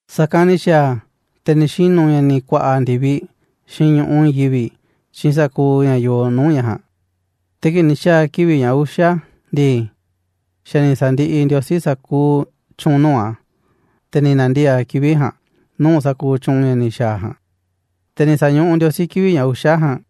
Sa̱kanꞌ ni̱ xa̱a̱ a̱, te̱ ni̱ xinu̱ ña̱ ni̱ ku̱a̱ꞌa̱ ndi̱viꞌ xiinꞌ ñu̱ꞌuꞌ i̱i̱n yivi̱ꞌ xiinꞌ sa̱kuuꞌ ña̱ yoo nuu̱ꞌ ña̱ ja̱a̱nꞌ. Te̱ kii̱ꞌ ni̱ xa̱a̱ kivi̱ꞌ ña̱ uxa̱ ndii, xa̱ ni̱ sa̱ndiꞌiꞌ Ndiosí sa̱kuuꞌ tyu̱u̱n nuu̱ꞌ a̱, te̱ ni̱ na̱ndiee̱ꞌ a̱ kivi̱ꞌ ja̱a̱nꞌ nuu̱ꞌ sa̱kuuꞌ tyu̱u̱n ña̱ ni̱ xa̱a̱ a̱ ja̱a̱nꞌ. Te̱ ni̱ sa̱ñuꞌuꞌ Ndiosí kivi̱ꞌ ña̱ uxa̱ ja̱a̱nꞌ,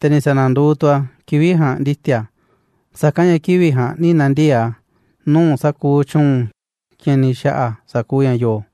te̱ ni̱ sa̱na̱nduuꞌ tu̱ a̱ kivi̱ꞌ ja̱a̱nꞌ ndi̱ti̱a̱ a̱, sa̱kanꞌ ña̱ kivi̱ꞌ ja̱a̱nꞌ ni̱ na̱ndiee̱ꞌ a̱ nuu̱ꞌ sa̱kuuꞌ tyu̱u̱n ña̱ ni̱ xa̱ꞌa̱ a̱ sa̱kuuꞌ ña̱ yoo.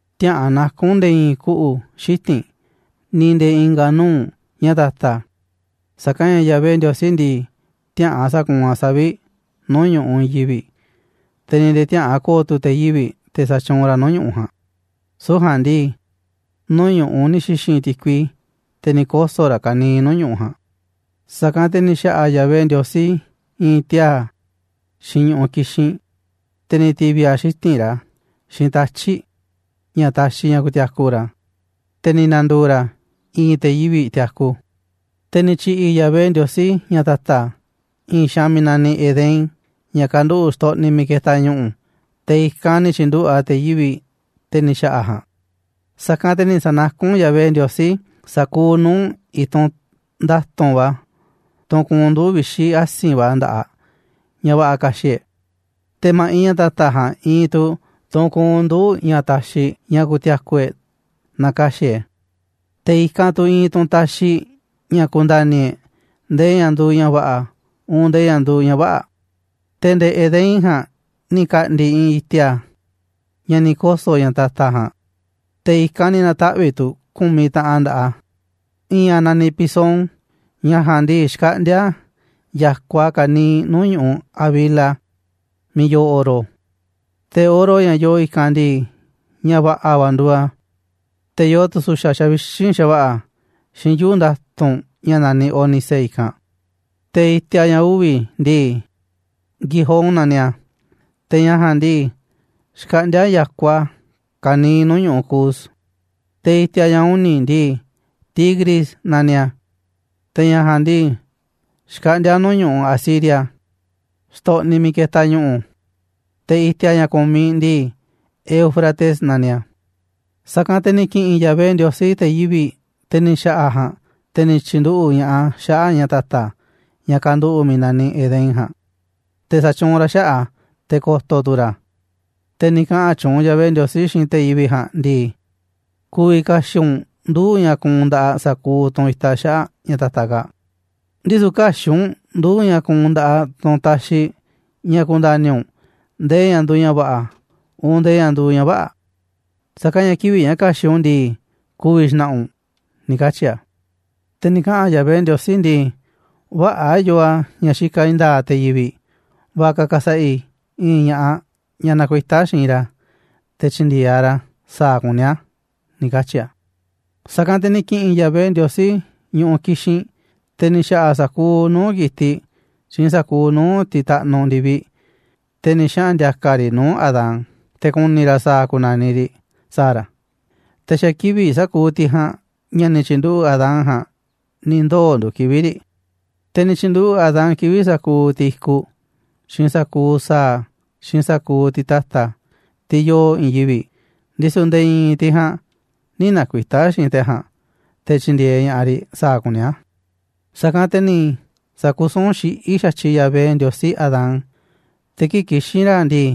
tiäꞌa̱an naku̱n nde̱e̱ i̱i̱n kuꞌu̱ xiti̱nꞌ, ni̱ nde̱e̱ i̱i̱n i̱nga̱ nuu̱ꞌ ña̱ ta̱ta̱, sa̱kanꞌ ña̱ Yahvé Ndiosí ndii, tiäꞌa̱an sa̱kuunꞌ a̱ savi̱ꞌ nuu̱ꞌ ñu̱ꞌuꞌ i̱i̱n yivi̱ꞌ, te̱ ni̱ nde̱e̱ tiäꞌa̱an ko̱o̱ tu̱ te̱ yivi̱ꞌ, te̱ sa̱tyuunꞌ ra̱ nuu̱ꞌ ñu̱ꞌuꞌ ja̱a̱nꞌ, süu̱ꞌ ja̱a̱nꞌ ndii, nuu̱ꞌ ñu̱ꞌuꞌ ni̱ xi̱xi̱n ti̱kui, te̱ ni̱ koso̱ raꞌ ka̱niiꞌ nuu̱ꞌ ñu̱ꞌuꞌ ja̱a̱nꞌ. Sa̱kanꞌ te̱ ni̱ xa̱ꞌa̱ Yahvé Ndiosí i̱i̱n tiaa̱ xiinꞌ ñu̱ꞌuꞌ ki̱xinꞌ, te̱ ni̱ ti̱vi̱ a̱ xiti̱nꞌ ra̱ xiinꞌ tatyi̱ꞌ, ña̱ taxiꞌ ña̱ ku̱ti̱a̱ku̱ ra̱, te̱ ni̱ na̱ndu̱u̱ ra̱ i̱i̱n te̱ yivi̱ꞌ tiaku. Te̱ ni̱ tyi̱ꞌi̱ Yahvé Ndiosí ña̱ ta̱ta̱ i̱i̱n xaanꞌ miiꞌ naniꞌ Edén, ña̱ kanduꞌu̱ꞌ xtoꞌniꞌ miiꞌ ketaꞌ ñu̱ꞌu̱, te̱ i̱kanꞌ ni̱ tyi̱nduꞌu̱ꞌ a̱ te̱ yivi̱ꞌ, te̱ ni̱ xa̱ꞌa̱ a̱ ja̱a̱nꞌ. Sa̱kanꞌ te̱ ni̱ sa̱nakún Yahvé Ndiosí sa̱kuuꞌ nuu̱ꞌ i̱tunꞌ nda̱tu̱nꞌ va̱, tunꞌ kuunꞌ nduu̱ꞌ vixi̱ asi̱nꞌ va̱ nda̱ꞌaꞌ, ña̱ va̱ꞌa̱ ka̱xi̱ꞌ e̱ꞌ, te̱ ma̱ꞌiꞌ ña̱ ta̱ta̱ ja̱a̱nꞌ iinꞌ tu̱ tunꞌ kuunꞌ nduu̱ꞌ ña̱ taxiꞌ ña̱ ku̱ti̱a̱ku̱ e̱ꞌ naaꞌ ka̱xi̱ꞌ e̱ꞌ e̱, te̱ i̱kanꞌ iinꞌ tu̱ tunꞌ taxiꞌ ña̱ ku̱nda̱ni̱ e̱ꞌ ndee ña̱ nduuꞌ ña̱ va̱ꞌa̱, uun ndee ña̱ nduuꞌ ña̱ vä̱ꞌa̱. Te̱ nde̱e̱ Edén ja̱a̱nꞌ ni̱ ka̱ꞌndi̱ i̱i̱n i̱ti̱a̱ ña̱ ni̱ koso̱ ña̱ ta̱ta̱ ja̱a̱nꞌ, te̱ i̱kanꞌ ni̱ na̱taꞌvi̱ꞌ tu̱ ku̱miꞌ taꞌan nda̱ꞌaꞌ a̱. I̱i̱n a̱ naniꞌ Pisón, ña̱ ja̱a̱nꞌ ndii, xkaꞌndíá ya̱kuaꞌ a̱ ka̱niiꞌ nuu̱ꞌ ñu̱ꞌuꞌ Havila, miiꞌ yoo oro. Te̱ oro, ña̱ yoo i̱kanꞌ ndii, ña̱ va̱ꞌa̱ va̱ nduuꞌ a̱, te̱ yoo tu̱ su̱xa̱ xavixínꞌ xa̱va̱ꞌa̱, xiinꞌ yuu̱ꞌ nda̱tu̱nꞌ ña̱ naniꞌ ónice i̱kanꞌ. Te̱ i̱ti̱a̱ ña̱ uvi̱ ndii, Gihón naniꞌ a̱, te̱ ña̱ ja̱a̱nꞌ ndii, xkaꞌndíá ya̱kuaꞌ a̱ ka̱niiꞌ nuu̱ꞌ ñu̱ꞌuꞌ Cus. Te̱ i̱ti̱a̱ ña̱ uni̱ ndii, Tigris naniꞌ a̱, te̱ ña̱ ja̱a̱nꞌ ndii, xkaꞌndíá a̱ nuu̱ꞌ ñu̱ꞌuꞌ Asiria, xtoꞌniꞌ miiꞌ ketaꞌ ñu̱ꞌu̱. Te̱ i̱ti̱a̱ ña̱ ku̱miꞌ ndii, Éufrates naniꞌ a̱. Sa̱kanꞌ te̱ ni̱ ki̱ꞌi̱n Yahvé Ndiosí, te̱ yivi̱ꞌ, te̱ ni̱ xa̱ꞌa̱ a̱ ja̱a̱nꞌ, te̱ ni̱ tyi̱nduꞌu̱ꞌ ña̱ꞌaꞌ a̱ xaꞌa̱ꞌ ña̱ ta̱ta̱, ña̱ kanduꞌu̱ꞌ miiꞌ naniꞌ Edén ja̱a̱nꞌ, te̱ sa̱tyuunꞌ ra̱ xaꞌa̱ꞌ a̱, te̱ ko̱to̱ tu̱ ra̱ a̱. Te̱ ni̱ kaꞌa̱n tyuunꞌ Yahvé Ndiosí xiinꞌ te̱ yivi̱ꞌ ja̱a̱nꞌ ndii: ―Ku̱vi̱ ka̱xi̱ꞌ u̱nꞌ nduu̱ꞌ ña̱ kuunꞌ nda̱ꞌaꞌ sa̱kuuꞌ tunꞌ itaꞌ xaꞌa̱ꞌ ña̱ ta̱ta̱ kaa̱ꞌ, ndisu̱ kä̱xi̱ꞌ u̱nꞌ nduu̱ꞌ ña̱ kuunꞌ nda̱ꞌaꞌ tunꞌ taxiꞌ ña̱ ku̱nda̱ni̱ u̱nꞌ ndee ña̱ nduuꞌ ña̱ va̱ꞌa̱, uun ndee ña̱ nduuꞌ ña̱ vä̱ꞌa̱, sa̱kanꞌ ña̱ kivi̱ꞌ ña̱ ka̱xi̱ꞌ u̱nꞌ u̱n ndii, ku̱vi̱ xna̱ꞌa̱ u̱nꞌ ―ni̱ katyi̱ a̱. Te̱ ni̱ kaꞌa̱n Yahvé Ndiosí ndii: ―Vä̱ꞌa̱ yoo a̱ ña̱ xikaꞌ i̱i̱n nda̱a̱ꞌ te̱ yivi̱ꞌ, va̱ꞌa̱ ka̱ ka̱sa̱ꞌa̱ i̱ i̱i̱n ña̱ꞌaꞌ, ñaꞌ nakuitá xiinꞌ ra̱ te̱ tyi̱ndi̱e̱eꞌ aꞌ ra̱ sa̱a̱ kuní a̱ ―ni̱ katyi̱ a̱. Sa̱kanꞌ te̱ ni̱ ki̱ꞌi̱n Yahvé Ndiosí ñu̱ꞌuꞌ ki̱xinꞌ, te̱ ni̱ xa̱ꞌa̱ a̱ sa̱kuuꞌ nuu̱ꞌ ki̱tiꞌ, xiinꞌ sa̱kuuꞌ nuu̱ꞌ tiꞌ taꞌnuꞌ ndi̱viꞌ, te̱ ni̱ xaꞌa̱n ndi̱a̱ka̱ a̱ riꞌ nuu̱ꞌ Adán, te̱ ku̱ni̱ ra̱ sa̱a̱ ku̱na̱niꞌ riꞌ sa̱a̱ ra̱, te̱ xa̱ kivi̱ꞌ sa̱kuuꞌ tiꞌ ja̱a̱nꞌ, ña̱ ni̱ tyi̱nduꞌu̱ꞌ Adán ja̱a̱nꞌ ni̱ ndoo̱ nduuꞌ kivi̱ꞌ riꞌ. Te̱ ni̱ tyi̱nduꞌu̱ꞌ Adán kivi̱ꞌ sa̱kuuꞌ tiꞌ i̱kuꞌ, xiinꞌ sa̱kuuꞌ sa̱a̱, xiinꞌ sa̱kuuꞌ tiꞌ ta̱ta̱, tiꞌ yoo i̱i̱n yivi̱ꞌ, ndisu̱ nde̱e̱ i̱i̱n tiꞌ ja̱a̱nꞌ nï̱ nakuitá xiinꞌ te̱ ja̱a̱nꞌ, te̱ tyi̱ndi̱e̱eꞌ ña̱ꞌaꞌ riꞌ sa̱a̱ kuní a̱. Sa̱kanꞌ te̱ ni̱ sa̱kusún xiꞌí xa̱tyiꞌ Yahvé Ndiosí Adán, te̱ kii̱ꞌ kixín ra̱ ndii,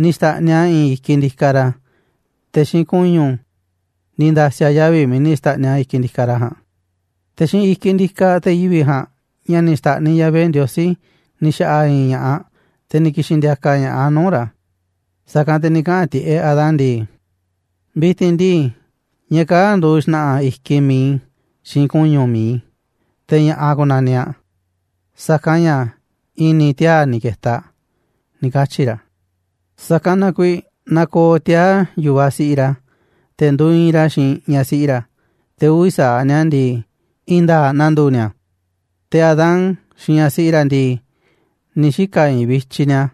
ni̱ xta̱ꞌniꞌ a̱ i̱i̱n i̱kiꞌ ndikaꞌ ra̱, te̱ xiinꞌ ku̱ñu̱ ni̱ nda̱si̱ a̱ yavi̱ miiꞌ ni̱ xta̱ꞌniꞌ a̱ i̱kiꞌ ndikaꞌ ra̱ ja̱a̱nꞌ. Te̱ xiinꞌ i̱kiꞌ ndikaꞌ te̱ yivi̱ꞌ ja̱a̱nꞌ, ña̱ ni̱ xta̱ꞌniꞌ Yahvé Ndiosí, ni̱ xa̱ꞌa̱ a̱ i̱i̱n ña̱ꞌaꞌ, te̱ ni̱ ki̱xi̱n ndi̱a̱ka̱ ña̱ꞌaꞌ a̱ nuu̱ꞌ ra̱. Sa̱kanꞌ te̱ ni̱ kaꞌa̱n tiꞌeꞌ Adán ndii: ―Vi̱ti̱n ndii, ñaꞌ kaa̱ꞌ nduuꞌ xna̱ꞌa̱ i̱kiꞌ mi̱iꞌ i̱ xiinꞌ ku̱ñu̱ mi̱iꞌ i̱, te̱ ña̱ꞌaꞌ ku̱na̱niꞌ aꞌ, sa̱kanꞌ ña̱ i̱ni̱ tiaa̱ ni̱ ke̱ta̱ aꞌ ―ni̱ katyi̱ ra̱. Sa̱kanꞌ na kuiiꞌ nakooꞌ tiaa̱ yu̱vaꞌ siꞌiꞌ ra̱, te̱ nduuꞌ iinꞌ ra̱ xiinꞌ ñaꞌ siꞌi ra̱, te̱ uvi̱ sa̱aꞌ ni̱a̱ ndii, i̱i̱n nda̱a̱ꞌ na̱ndu̱u̱ ni̱a̱. Te̱ Adán xiinꞌ ñaꞌ siꞌi ra̱ ndii, ni̱ xika̱ i̱i̱nꞌ vityiꞌ ni̱a̱,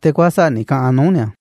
te̱ kuäsa̱ꞌ ni̱ ka̱ꞌa̱n nuu̱ꞌ ni̱a̱.